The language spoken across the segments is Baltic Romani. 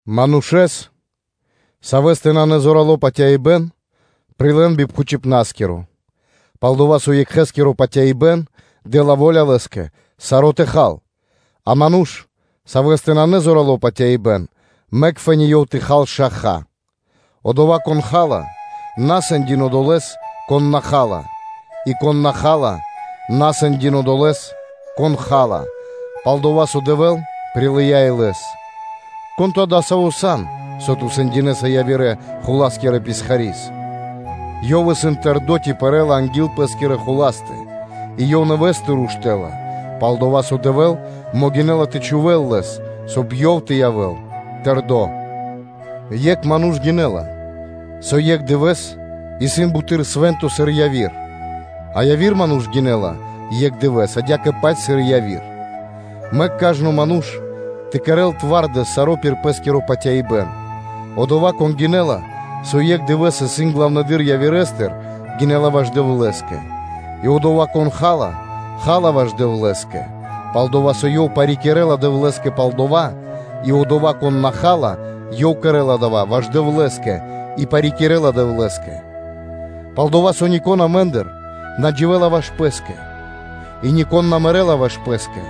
Манушэ́с, савэ́стэ нанэ зорало́ патяибэ́н, прилэ́н би пхучибнаскиро. Пал-дова́ со екхэскиро патяибэ́н дэ́ла во́ля лэ́скэ саро́ тэ хал, а ману́ш, савэ́стэ нанэ зорало́ патяибэ́н, мэк фэ́ни ёв тэ хал шаха (овошчы). Одова́, кон ха́ла, на сэндякир одолэ́с, кон на ха́ла; и кон на ха́ла, на сэндякир одолэ́с, кон ха́ла, пал-дова́ со Дэвэ́л прилыя́ и лэс. Кон ту адасаво́ сан, со ту сэндякирэса явирэ – хула́скирэ писхари́с? Ёв исын тэрдо́ ци пэрэ́ла анги́л пэ́скирэ хуластэ. И ёв нэвэ́стыр уштэ́ла, пал-дова́ со Дэвэ́л могинэ́ла тэ чхувэ́л лэс, соб (кай) ёв тэ явэ́л тэрдо́. Екх ману́ш гинэ́ла, со екх дывэ́с исын буты́р свэ́нто, сыр яви́р, а яви́р ману́ш гинэ́ла екх дывэ́с адя́кэ-паць, сыр и яви́р. Мэк кажно ману́ш тэ кэрэ́л саро́ пир пэ́скиро патяибэ́н. Одова́, кон гинэ́ла, со екх дывэ́с исын главнэдыр явирэстыр, гинэ́ла ваш Дэвлэ́скэ. И одова́, кон ха́ла, ха́ла ваш Дэвлэ́скэ, пал-дова́ со ёв парикирэла Дэвлэ́скэ пал дава́; и одова́, кон на ха́ла, ёв кэрэ́ла дава́ ваш Дэвлэ́скэ, и парикирэла Дэвлэ́скэ. Пал-дова́ со нико́н амэ́ндыр на дживэ́ла ваш пэ́скэ и нико́н на мэрэ́ла ваш пэ́скэ.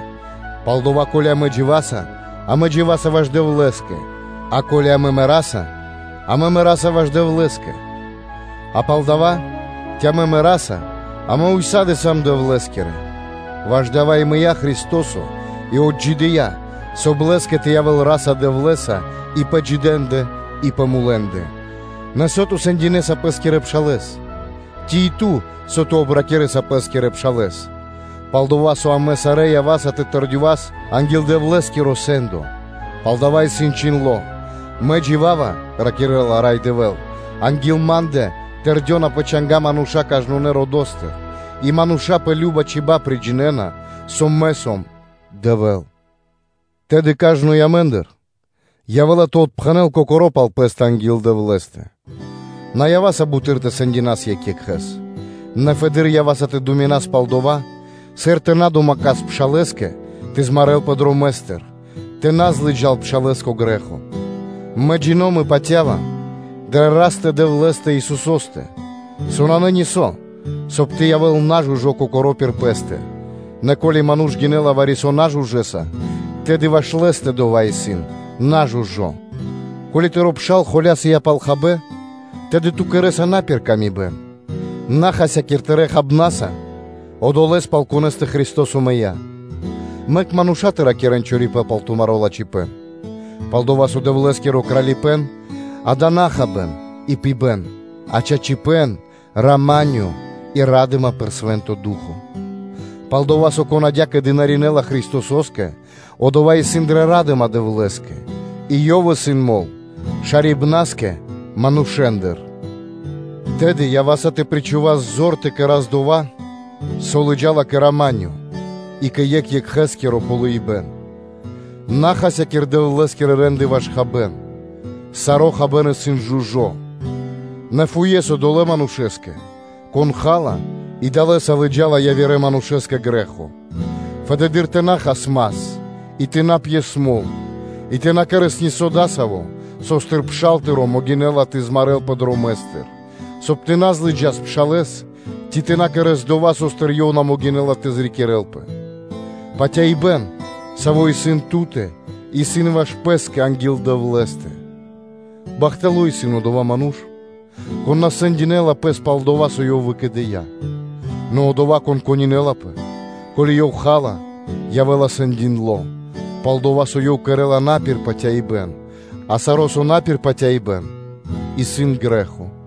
Палдава́, ко́ли амэ дживаса, амэ дживаса ваш Дэвлэ́скэ; а ко́ли амэ мэраса, амэ мэраса ваш Дэвлэ́скэ: а палдава́, ци амэ мэраса, амэ ўса́ды (сак) сам Дэвлэ́скирэ. Ваш дава́ и мыя́ Христо́со, и отджидыя́, соб (кай) Лэ́скэ тэ явэ́л Ра́са-Дэвлэ́са и пэ джидэндэ и пэ мулэндэ. Нэ со ту сэндякирэса пэ́скирэ пшалэ́с? Ци и ту, со ту обракирэса пэ́скирэ пшалэ́с? Пал-дова́ со амэ сарэ́ ява́са тэ тэрдёвас анги́л Дэвлэ́скиро сэ́ндо. Палдава́ исын чхиндло́: “Мэ джива́ва, – ракирэ́ла Рай Дэвэ́л, – анги́л Ма́ндэ тэрдёна пэ чанга́ мануша́ кажнонэ́ родо́стыр и мануша́ пэ кажна чиба́ (чибья́) приджинэна, со Мэ сом Дэвэ́л.” Тэды кажно амэ́ндыр явэ́ла тэ отпхэнэл кокоро́ пал пэ́стэ анги́л Дэвлэ́стэ. На ява́са буты́р тэ сэндякирас екх екхэ́с; нэ фэды́р ява́са тэ думинас пал дова́, сыр тэ на домэкас пшалэ́скэ тэ змарэлпэ дромэ́стыр, тэ на злыджас пшалэ́с кэ грэ́хо. Мэ джино́м и патя́ва дрэ Растэ-Дэвлэ́стэ Исусо́стэ, со нанэ нисо́, соб (кай) тэ явэ́л нажужо кокоро́ пир пэ́стэ; нэ ко́ли ману́ш гинэ́ла вари-со нажужэса, тэды ваш лэ́стэ дова́ исын нажужо. Ко́ли тыро́ пшал холясо́ла пал хабэ́н, тэды ту кэрэ́са на пир ило́. На хасякир тырэ́ хабнаса одолэ́с, пал конэ́стэ Христо́со мыя́. Мэк мануша́ тэ на ракирэ́н чорипэ́н пал тумаро́ лачхипэ́н; пал-дова́ со Дэвлэ́скиро Кралипэ́н-дава́ исын на хабэ́н и пибэ́н, а чачипэ́н, рама́нё и ра́дыма пир Свэ́нто Ду́хо (Фа́но). Пал-дова́ со, кон адя́кэ дынаринэла Христосо́скэ, одова́ исын дрэ ра́дыма Дэвлэ́скэ и ёв исын мол шарибнаскэ манушэ́ндыр. Тэды ява́са тэ причхувас зор тэ кэра́с дова́, со лыджа́ла кэ рама́нё (миро) и кэ екх екхэскиро ґалыибэ́н. На хасякир Дэвлэ́скирэ рэ́нды ваш хабэ́н. Саро́ хабэ́н исын жужо́ (чысто); нэ фуес одолэ́ манушэ́скэ, кон ха́ла и далэ́са лыджа́ла явирэ манушэ́с кэ грэ́хо. Фэды́р тэ на хас мас, и тэ на пьес мол и тэ на кэрэ́с нисо́ дасаво, со́стыр тыро́ пшал могинэ́ла тэ змарэлпэ дромэ́стыр, соб (кай) тэ на злыджас пшалэ́с, ци тэ на кэра́с дова́, со́стыр ёв на могинэ́ла тэ зрикирэлпэ. Патяибэ́н, саво́ исын ту́тэ, исын ваш пэ́скэ анги́л Дэвлэ́стэ. Бахтало́ исын одова́ ману́ш, кон на сэндякирэ́ла пэс пал дова́, со ёв выкэдыя́. Нэ одова́, кон пиридуминэла, ко́ли ёв ха́ла, явэ́ла сэндякирдо, пал-дова́ со ёв кэрэ́ла на пир патяибэ́н; а саро́, со на пир патяибэ́н, исын грэ́хо. [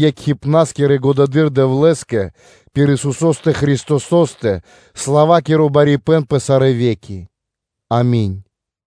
Екхджинэ́скэ и Най Годьварэдырэ Дэвлэ́скэ, пир Исусо́стэ Христосо́стэ тэ явэ́л сла́ва пэ сарэ́ ве́ки. Ами́нь.-р.с.]